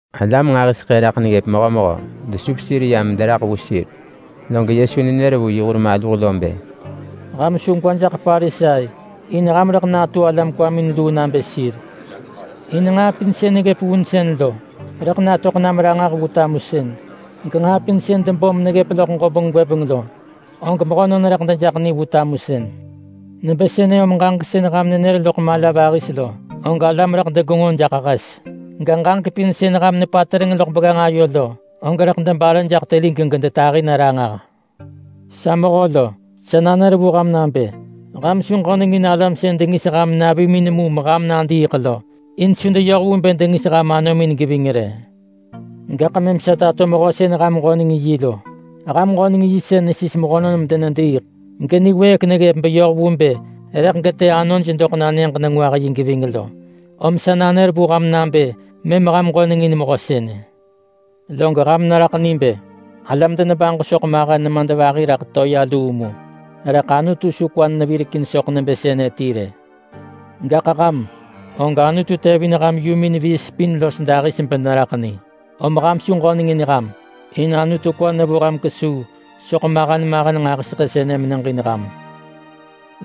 Alam nġahiseḳë raḳ neggëp mehömehö desup sir yam mederaḳ vu sir, log Yesu nenër vu yi hur maluh lo bë, “Ham su gwa jaḳ Parisai, in ham rëḳ natu alam kwamin luu nabë sir. In nġaa pin sën neggëp vunsën lo, rëḳ natöḳ nam ranġah vu tamusën. Genġaa pin sën debom meneggëp loḳ ġobeng gwëbeng lo, og mehönon rëḳ dejaḳ ni vu tamusën. Nebë sënë om ġaġek sën ham nenër loḳ mala vahis lo, og alam rëḳ degenġo jaḳ hes. Ga, ġaġek pin sën ham nepatereng loḳ begganġ ayo lo, og rëḳ debare jaḳ telig gedetahi na ranġah.” “Sa mehö lo, sa nanër vu ham nabë: Ham su ġönengin alam sën dengis ham navimin mu meham nadiiḳ lo. In su deyoh vu bë dengis ham anomin geving rë. Gaḳ mëm sa tato mehö sën ham ġönengin yi lo: Ham ġönengin yi sën nesis mehönon medenediiḳ, geniwëëk neggëp beyoh vu bë rëḳ getë anoj doḳ na Nyëġ-nengwah-yi geving lo. Om sa nanër vu ham nabë mëm ham ġönengin Mehö sënë. Log ham neraḳ ni. Alam denebaġo soḳ mahen nemadvahi raḳ toea luu mu, rëḳ Anutu su kwa nevirekin soḳ nebë sënë ti rë. Gaḳ ham, og Anutu tevin ham yumin viis pin los dahis beneraḳ ni. Om ham su ġönengin ham, in Anutu kwa nevo ham kesuu soḳ mahen mahen nġahiseḳë sënë meneġin ham.”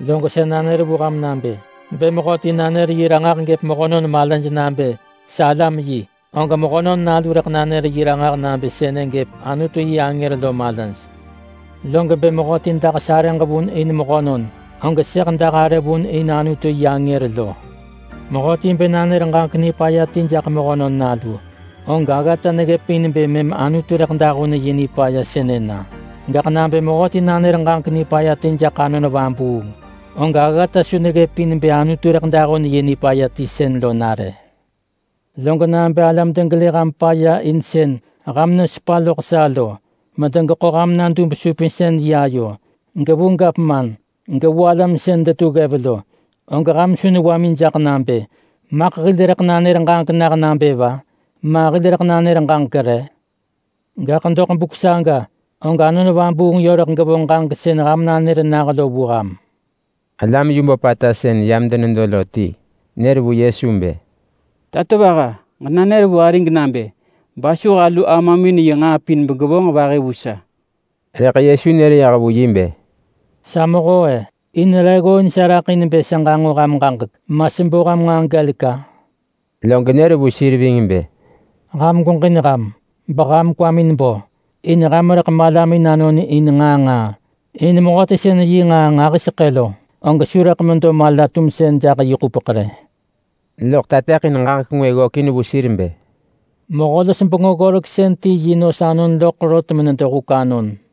“Log sa nanër vu ham nabë: Bë mehöti nanër yi ranġah gëp mehönon malaj nabë sa alam yi, og Mehönon Nalu rëḳ nanër yi ranġah nabë sënë gëp Anutu yi angër lo malaj. Log bë mehöti dah sarëġ vun in mehönon, og sëḳ dah arë vun in Anutu yi angër lo. Mehöti bë nanër ġaġek nipaya ti jaḳ Mehönon Nalu, og aggata neggëp in bë mëm Anutu rëḳ dahun yi nipaya sënë na. Gaḳ nabë mehöti nanër ġaġek nipaya ti jaḳ Anon Vabuung, og aggata su neggëp in bë Anutu rëḳ dahun yi nipaya ti sën lo na rë. Log nabë alam degelë ham paya in sën ham nesepa loḳ sa lo medegeḳo ham na dub-supinsën-yi ayo, gevu gavman, gevu alam sën detu ggev lo, og ham su newamin jaḳ nabë, ‘Maḳ hil rëḳ nanër ġaġek nah nabë va? Ma hil rëḳ nanër ġaġek re?’ Gaḳ doḳ buk saga, og Anon Vabuung yö rëḳ gevonġ ġaġek sën ham nanër nah lo vu ham.” Alam yu böpata sën yam denedo lo ti nër vu Yesu bë, “Tatovaha, ġenanër vu arig nabë basuh alu amamin yi nġaa pin begevonġ vahi vu sa.” Rëḳ Yesu nër yah vu yi bë, “Sa mehö-e! In re ggooin sa raḳ in bë sa ġanġo ham ġaġek, ma sebo ham nġaa gelek-a?” Log nër vu sir ving bë, “Ham gweġin ham! Beham kwamin bo in ham rëḳ malamin anon in nġaa nġaa. In mehöti sën yi nġaa nġahiseḳë lo, og su rëḳ medo mala-tumsën jaḳ yi ḳupeḳ rë.” Loḳ tateḳin ġaġek ngwë ggökin vu sir bë, “Mehö-los-bengö-ggoreksën ti yi nos anon loḳ rot menedo huk anon.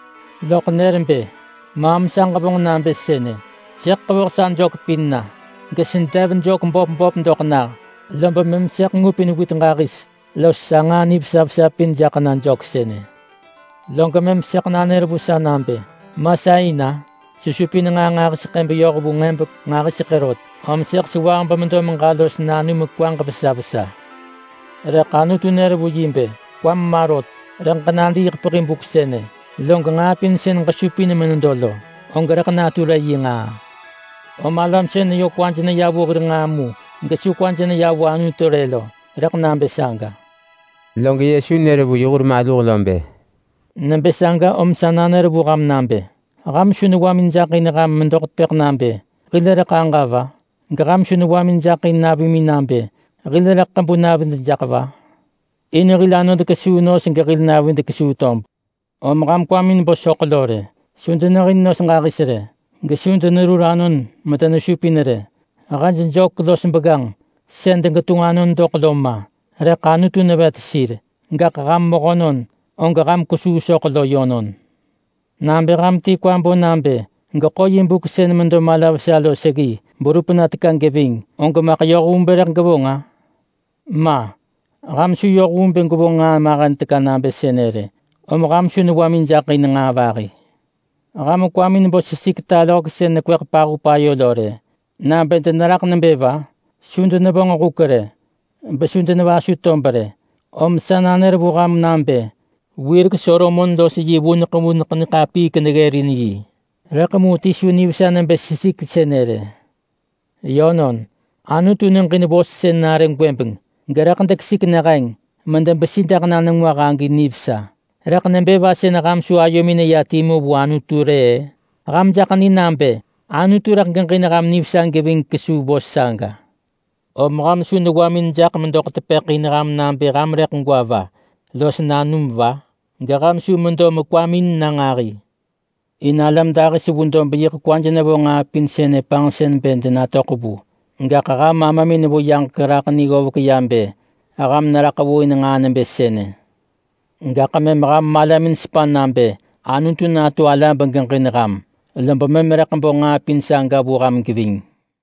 Loḳ nër bë, ‘Maam sa ġevonġ nabë sënë: Sëḳ ḳevoh sa jök pin na, gesedev böp böp doḳ nah. Lob mëm sëḳ ngupin wit ġahis los sa nġaa nivesa vesa pin jaḳ na jök sënë. Log mëm sëḳ nanër vu sa nabë, “Ma sa in-a! Sesupin nġaa nġahiseḳë beyoh vu nġebek nġahiseḳë rot. Om sëḳ sewah bemedo meġa los nanum kwaġ vesa vesa.” ’ Rëḳ Anutu nër vu yi bë, ‘Kwam ma rot! Rëḳ ġenadiiḳ pehi buk sënë. Log nġaa pin sën ġesupin menedo lo, og rëḳ natu re yi ngaa?’ Om alam sën yö kwaj neya vu hir nġaa mu gesu kwaj neya vu Anutu rë lo, rëḳ nabë saga.” Log Yesu nër vu yi hur maluh lo bë, “Nebë saga om sa nanër vu ham nabë: Ham su newamin jaḳ in ham medoḳ tepëḳ nabë, ‘Hil rëḳ aġa va?’ Geham su newamin jaḳ in navimin nabë, ‘Hil rëḳ ḳebu navid jaḳ va?’ In hil anod kesuu nos gehil navid kesuu tob. Om ham kwamin bo soḳ lo rë. Su denehin nos ġahis rë, gesu denerur anon medenesupin rë. Hej jök los begganġ sën degetunġ anon doḳ lo ma. Rëḳ Anutu nevet sir. Gaḳ ham mehönon, og ham kwesuu soḳ lo yönon! Nabë ham ti kwa bo nabë geḳo yi buk sën medo mala vesa lo seggi berup na teka geving, og maḳ yoh vu bë rëḳ gevonġ-a? Ma! Ham su yoh vu bë gwevonġ nġaa mahen teka nabë sënë rë, om ham su newamin jaḳ in nġaa vahi. Ham kwamin bo sesik talohek sën nekweḳ pahup ayo lo rë nabë deneraḳ nebë va? Su denevonġ huk rë, besu denevasu tob rë. Rëḳ mu sa nanër vu ham nabë: Wirek Solomon los yi vuneḳ vuneḳ niḳapiik neggërin yi, rëḳ mu ti su nivesa nebë sesik sënë rë. Yönon, Anutu neġin vos sën nare gwëbeng gerëḳ dekesik neheng medebesi jaḳ na nengwah agi nivesa. Om nebë va sën ham su ayomin neya timu vu Anutu rë-ë? Ham jaḳ ni nabë Anutu rëḳ geġin ham nivesa geving kesuu vos saga. Om ham su newamim jaḳ medoḳ tepëḳ in ham nabë ham rëḳ gwa va los nanum va? Geham su medo mekwamin na nġahi. In alam dahis vu dob yiḳ kwaj nevo nġaa pin sënë panġsën bë denatöḳ vu. Gaḳ ham Amamin vu yaġek raḳ ni ggovek ya bë ham neraḳ vu in nġaa nebë sënë. Gaḳ mëm ham malamin sepa nabë Anutu natu ala begeġin ham, lob mëm rëḳ bo nġaa pin saga vu ham geving.”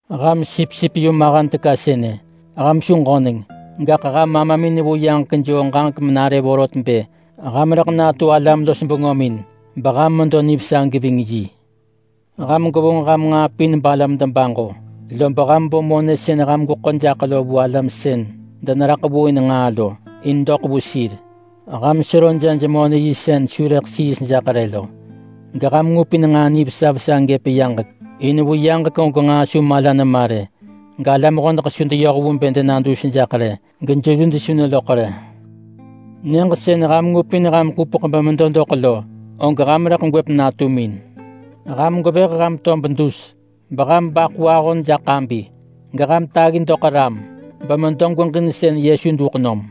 “Ham sipsip yu mahen teka sënë, ham su ġöneng! Gaḳ ham Amamin vu yaġek joo ġaġek menare vorot bë ham rëḳ natu alam-los-bengömin beham medo nivesa geving yi. Ham gwevonġ ham nġaa pin balam debaġo, lob ham bo monë sën ham gweḳo jaḳ lo vu alam sën deneraḳ vu in nġaa lo in doḳ vu sir. Ham sero jej-monë-yi sën su rëḳ siis jaḳ rë lo. Geham ngupin nġaa nivesa vesa gëp yaġek, in vu yaġek og nġaa su mala nema rë galam hodeḳ su deyoh vu bë dena dus jaḳ rë, gejeluj su neloḳ rë. Nyëġ sën ham ngupin ham ḳupeḳ bemedo doḳ lo, og ham rëḳ gwëp natumin.” “Ham gwevëh ham tob dus, beham baḳu ahon jaḳ ḳabi, geham taggi doḳ ram, bemedo gweġin Yesu duḳ nom.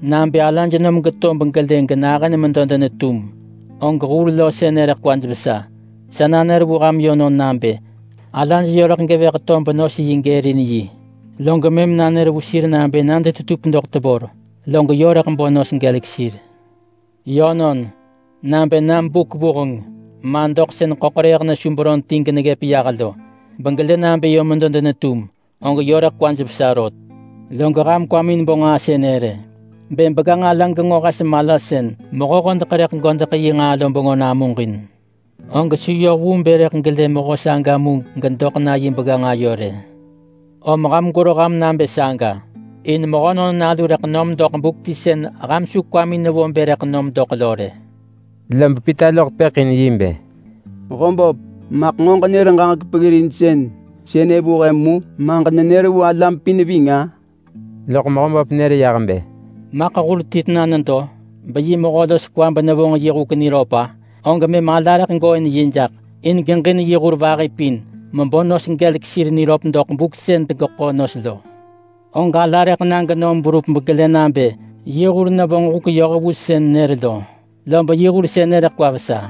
Nabë alaj nom geto begelë genahën medo denetum, og hur lo sënë rëḳ kwaj vesa. Sa nanër vu ham yönon nabë: Alaj yö rëḳ gevëh tob nos yi gërin yi, log mëm nanër vu sir nabë na detetup doḳ tevor. Log yö rëḳ bo nos gelek sir. Yönon, nabë nam buk vuheng, ma doḳ sën ḳöḳrëëh nesu beron ti geneggëp yah lo, begelë nabë yö nedo denetum, og yö rëḳ kwaj vesa rot. Log ham kwamin bo nġaa sënë rë: Bë begganġ ala genġo hes mala sën mehö hodeḳ rëḳ godeḳ yi nġaa lo bengö namuġin, og su yoh vu bë rëḳ gelë mehö saga mu gedoḳ na yi begganġ ayo rë. Om ham gwero ham nabë saga, in Mehönon Nalu rëḳ nom doḳ buk ti sën ham su kwamin nevo bë rëḳ nom doḳ lo rë.” Lob Pita loḳ tepëḳ in bë, “Mehöböp, maḳ nġo ġenër ġaġek peggirinsën sënë vu he mu, ma ġenenër vu alam pin ving-a?” Loḳ Mehöböp nër yah bë, “Maḳ hur ti tena nedo, beyi mehö los kwa benevonġ yi huk niröp-a? Og mëm ala rëḳ gooin yi jaḳ in geġin yi hur vahi pin mebo nos gelek sir niröp doḳ buk sën degeḳo nos lo! Og ala rëḳ na genom berup begelë nabë yi hur nevonġ huk yoh vu sën nër lo, lob yi hur sënë rëḳ kwa vesa.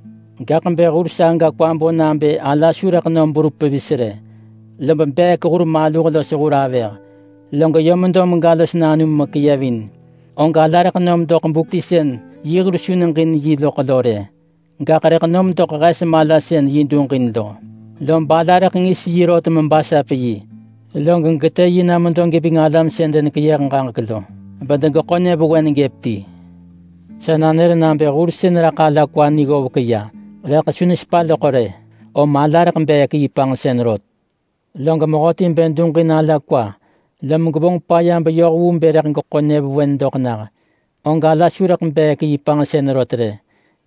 Gaḳ bë hur saga kwa bo nabë ala su rëḳ nom berup pevis rë, lob beek hur maluh los hur avëh, log yö medo mega los nanum mekeyevin, og ala rëḳ nom doḳ buk ti sën yi hur su neġin yi loḳ lo rë, gaḳ rëḳ nom doḳ hes mala sën yi duġin lo. Lob ala rëḳ ngis yi rot mebasap yi, log getë yi na medo geving alam sën denekeyëh ġaġek lo, bedegeḳo nyëvewen gëp ti. Sa nanër nabë hur sën neraḳ ala kwa ni ggovek ya, rëḳ mu su nesepa loḳ rë, om ala rëḳ beek yi panġsën rot. Log mehöti bë duġin ala kwa lom gevonġ paya beyoh vu bë rëḳ geḳo nyëvewen doḳ nah, og ala su rëḳ beek yi panġsën rot rë.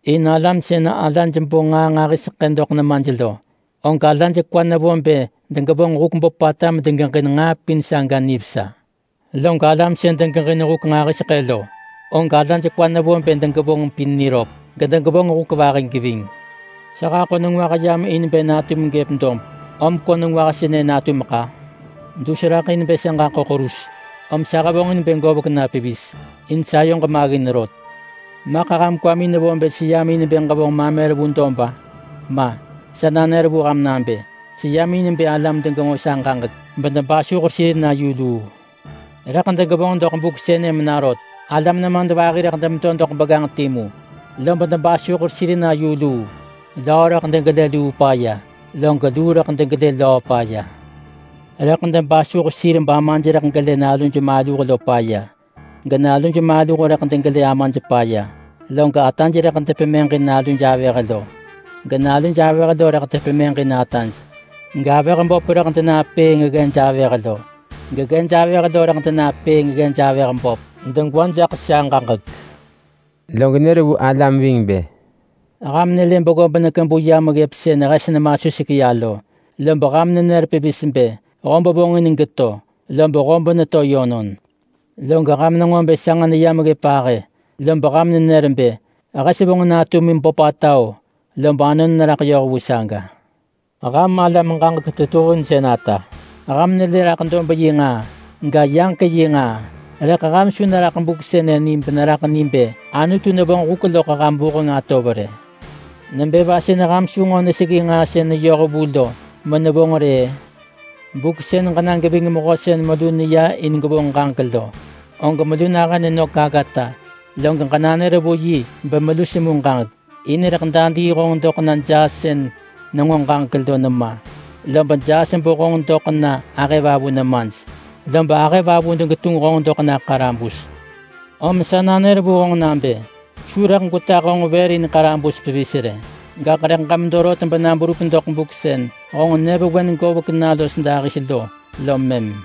In alam sën alaj bo nġaa nġahiseḳë doḳ nemaj lo, og alaj kwaj nevo bë degevonġ huk böpata medegeġin nġaa pin saga nivesa. Log alam sën degeġin huk nġahiseḳë lo, og alaj kwaj nevo bë degevonġ pin niröp, gedegevonġ huk vahi geving.” “Sa haḳo nengwah yam in bë natum gëp dob, om ko nengwah sënë natumeḳ-a! Dus raḳ in bë sa ġaḳo ḳerus, om sa hevonġin bë govek na pevis in sayoġ maggin rot. Maḳ ham kwamin nevo bë seyam in bë ġevonġ mamer vu dob-a? Ma! Sa nanër vu ham nabë: Seyam in bë alam degenġo sa ġaġek bedebasuh sir na yu luu. Rëḳ degevonġ doḳ buk sënë mena rot. Alam nemadvahi rëḳ demedo doḳ begganġ timu, lob debasuh sir na yu luu. Löö rëḳ degelë luu paya, log luu rëḳ degelë löö paya. Rëḳ debasuh sir bamaj rëḳ degelë naluj maluh lo paya, genaluj maluh rëḳ degelë amaj paya. Log ataj rëḳ depemëġin naluj avëh lo, genaluj avëh lo rëḳ depemëġin ataj. Gavëh böp rëḳ denapëëng ggej avëh lo geggej avëh lo rëḳ denapëëng ggej avëh böp, degwa jaḳ sa ġaġek.” Log nër vu alam ving bë, “Ham nelë beggob nekebu yam ggëp sën hes nemasuseḳ ya lo, lob ham nenër pevis bë, ‘Hob vonġin geto!’ Lob hob neto yönon. Log ham nenġo bë sanġ neyam ggëp ahë, lob ham nenër bë, ‘Hes vonġin natum böpata-o!’ Lob anon neraḳ yoh vu saga. Ham alam ġaġek tetuhinsën ata! Ham nelë raḳ dob yi nġaa, ga, yaġek yi nġaa. Rëḳ ham su neraḳ buk sënë ni beneraḳ ni bë Anutu nevonġ huk loḳ ham vuheng atov rë.” “Nebë va sën ham su nġo neseggi nġaa sën neyoh vu lo menevonġ rë-ë? Buk sën ġenena geving mehö sën melu neya in gwevonġ ġaġek lo, og melu nahën nenök aggata, log ġenanër vu yi bemelu semu ġaġek, in rëḳ dadii honġ doḳ na jaas sën nenġo ġaġek lo nema. Lob jaas bo honġ doḳ na ahëvavu nemaj, lob ahëvavu degetunġ honġ doḳ na ḳarabus. Om sa nanër vu honġ nabë: Su rëḳ gwetah honġ vër in ḳarabus pevis rë. Gaḳ rëḳ ġemedo rot bena berup doḳ buk sën honġ nyëvewen govek na los dahis lo lom mëm.”